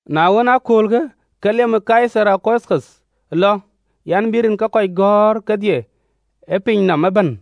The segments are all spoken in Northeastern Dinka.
Na ɣɔn ë aköölkë, ke liëm ë Kaithar Augutho lɔ an, bï rin ke kɔc gɔ̈ɔ̈r kedhie ë piny nɔm ëbɛ̈n.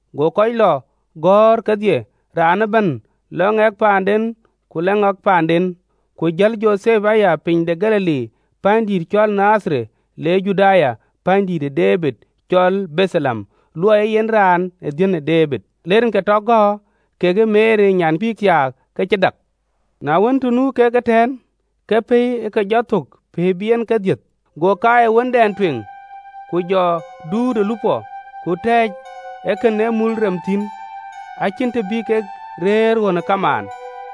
Go kɔc lɔ gɔ̈ɔ̈r kedhie, raan ëbɛ̈n, lɔ ŋɛk paanden, ku lɔ ŋɛk paanden. Ku jël Jothep aya piny de Galili pänydït cɔl Nadhareth, le Juda, Pänydït de Debid, cɔl Betheleɣem, luɔɔi ee yen raan dhiën ë Debid. Le rinke tɔ gäär kekë Meri nyan bï thiaak, ke cï dak. Na wën, të nu kek ëtɛ̈ɛ̈n, ke pɛ̈i ë ke jɔ thök, pɛ̈i bï en ke dhiëth. Go kaai ë wëndɛn tueŋ, ku jɔ duut ë lupɔ, ku tɛ̈ɛ̈c ë kën ee mul rem thïn, acïn të bï kek rëër ɣön ë kamaan.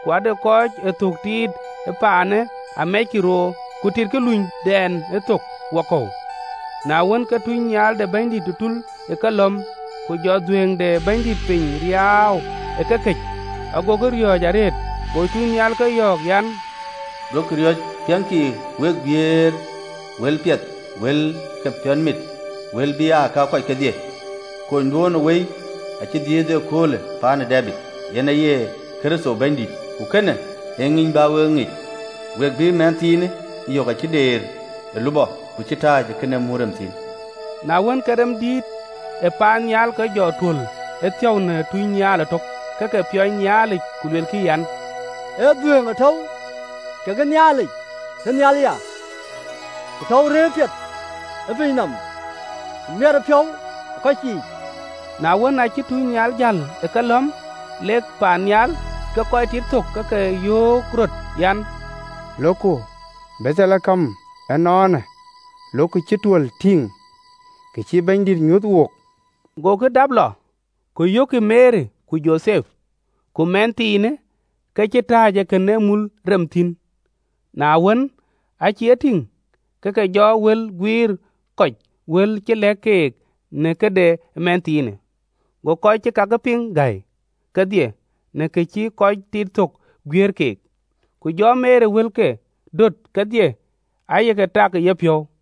Ku ade kɔc ee thök tiit ee pinyë amɛckï roor, ku titkï lunydɛn ë thök wakɔ̈u. Na wën, ke tunynhial ë Bɛ̈nydït tul ë kelɔ̈m, ku jɔ dhuëëŋ de Bɛ̈nydït piny riaau ë kekëc: agokï riɔ̈ɔ̈c arëët: Go tunynhial ke yɔ̈ɔ̈k an, “Duökï riɔ̈c, piɛŋkï, wek guiëër wël piɛth wël ke piɔ̈nmit, wël bï aa ka ke kɔc kedhie. Konyduön ë wëi acï dhiëëth ee köölë Pänydït de Debid, yen Kërtho Bɛ̈nydït. Ku kënë ee ŋïny bä wek e ŋic, we bï mɛnhthiinë yök acï deer ë lupɔ, ku cï tääc ë kën ee mul rem thïn.” Na wën, ke remdïït ë paannhial ke jɔ tuöl ëthiäu në tunynhial ëtök, ke ke piɔny Nhialic, ku luelkï, an: “Ë dhuëëŋ tɔ̈u kekë Nhialic tënhial ya, ku tɔ̈u rëër piɛth ë piny nɔm, ku miɛtëpiɔ̈u ë kɔc yiic!” Na wën, aacï tuucnhial jäl ë kelɔ̈m lek paannhial, ke kɔc tit thök ke ke yöök röt an, “Lokku Betheleɣem ënɔɔnë, lok kë cï tuöl tïŋ, kë cï Bɛ̈nydït nyuöth wook.” Gokï dap lɔ, ku yökkï Meri ku Jothep, ku mɛnhthiinë ke cï tääc ë kën ee mul rem thïn. Na wën, aa cïk e tïŋ, ke ke jɔ wël guiëër kɔc wël cï lɛ̈k keek në këde mɛnhthiinë. Go kɔc cï kakë piŋ gäi kedhie në ka cï tïït ke thök guiëër keek. Ku jɔ Meri wëlkë döt kedhie, aye ke tak ë yepiɔ̈u.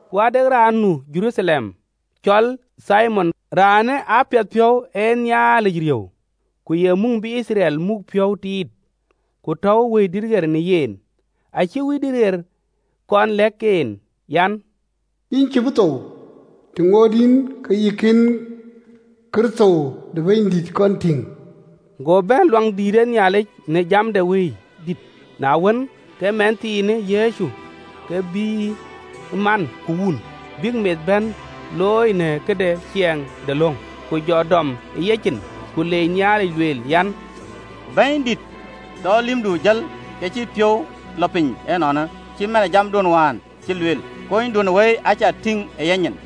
Ku ade raan nu Jeruthalem, cɔl Thimion, raanë apiɛthpiɔ̈u, ee Nhialic riëëu, ku ye muŋ bï Yithriɛl muk piɔ̈u tiit, ku tɔ̈u Wëidït ɣer në yen. Acï Wëidït ɣer kɔn lɛ̈k en an, Yïn cïï bï thou, të ŋoot yïn ke yï kën Kërtho de Bɛ̈nydït kɔn tïŋ. Go bɛ̈n Luaŋdït në jam de Wëidït: na wën, ke mɛnhthiinë Yecu ke bïïyë man ku wun, bïk meth bɛ̈n looi në këde ciɛɛŋ de löŋ, Ku jɔ dɔm ë yecin, ku leec Nhialic lueel an, “Bɛ̈nydït, tɔ lïmdu jël ke cï piɔ̈u lɔ piny ënɔɔnë, cït man ë jamduön wään cï lueel, Kunyduön ë wëi acä tïŋ ë yanyin,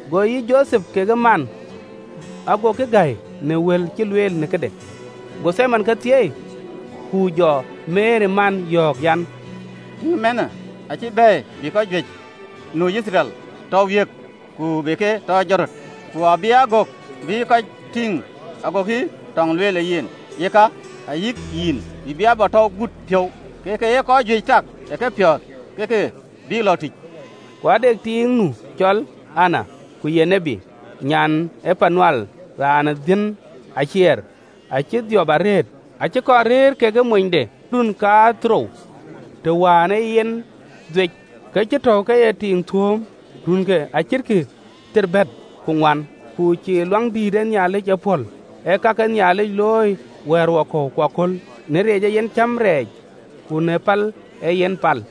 Go yï Jothep kekë man agokï gäi në wël cï lueel në këde. Go Thimion ke thieei, ku jɔ Meri man yɔ̈ɔ̈k an, “Tïŋ mɛnhë acï bɛ̈ɛ̈i bï kɔc juëc nu Yithriɛl tɔ wiëëk ku be ke tɔ jɔt röt, ku abï aa gök bï kɔc tïŋ agokï tɔŋ lueel në yen, yeka ayïk yïn, yïn bïï abätäu gut piɔ̈u, ke ka ye kɔc juëc tak ë kepiɔ̈ɔ̈th ke ke bï lɔ̈ɔ̈k tïc.” Ku ade tiiŋ nu cɔl Ana, ku ye tiët, nyan ë Panwɛl, raan dhiën ë Acer: acï dhiɔp arëët, acï kɔn rëër kekë monyde ë run kadhorou të wään ee yen dhuec, Ke acï tɔ̈u ke ye tiiŋ thuööm runke acïtkï thiërbɛ̈t ku ŋuan, ku cïï Luaŋdït ee pɔ̈l, ee ka ke Nhialic looi wɛ̈ɛ̈rwakɔ̈u ku aköl, në reec ee yen cäm rɛɛc ku në pal yen pal.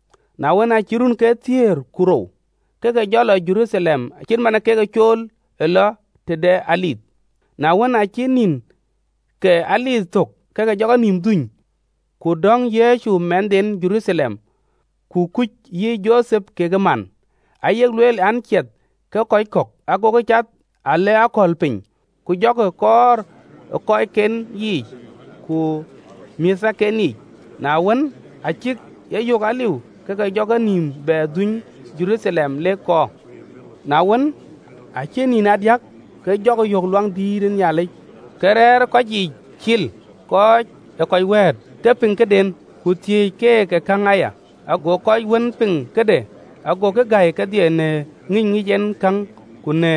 Na wën, aacï runke thiëër ku rou, ke ke jɔ lɔ Jeruthalem cït man ee kek cool ë lɔ tëde dhuëëŋ. Na wën, aa cïk nïn ke dhuëëŋ thöl, ke ke jɔ kenïïm dhuny, ku döŋ Yecu mɛnhden Jeruthalem, ku kuc yï Jothep kekë man, ayek lueel an, ciɛth ke kɔc kɔ̈k, agokï cath a le akɔ̈l piny, ku jɔkï kɔɔr ë kɔcken yiic ku määthken yiic. Na wën, aa cïk e yök aliu, ke ke jɔ kenïïm bɛ dhuöny Jeruthalem, lek kɔɔr. Na wën, aa cï nïn aa diäk, ke jɔkï yök ë Luaŋdït yic, ke rɛ̈ɛ̈r ë kɔc yiic cil kɔc ee wëët, ke piŋ këden, ku thiëc keek käŋ aya. Ago kɔc wën piŋ këde agokï gäi kedhie në ŋïny ŋic en käŋ ku në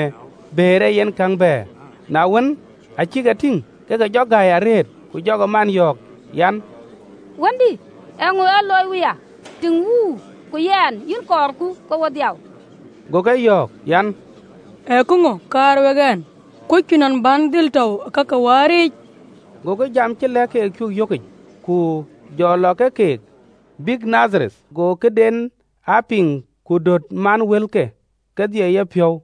bëër ee yen käŋ bɛ̈ɛ̈r. Na wën, aa cïk e tïŋ, ke ke jɔ gäi arëët: ku jɔ man yɔ̈ɔ̈k an, “Wëndï, eeŋö ë luöiyë wook wuya? Tïŋ, wuur ku yɛn yïn cuk kɔɔr ke wo dhiau.” Go ke yɔ̈ɔ̈k an, “Ee käŋö ë kaar wek ɛn? Kuöckï nɔn duëër ɛn dhil tɔ̈u baai de wäär?” Gokï jam cï lɛ̈k keek cuö yökic. Ku jɔ Yecu lɔ ke keek, bïk Nadhareth, go këden aa piŋ, ku döt man wëlke kedhie ë yepiɔ̈u.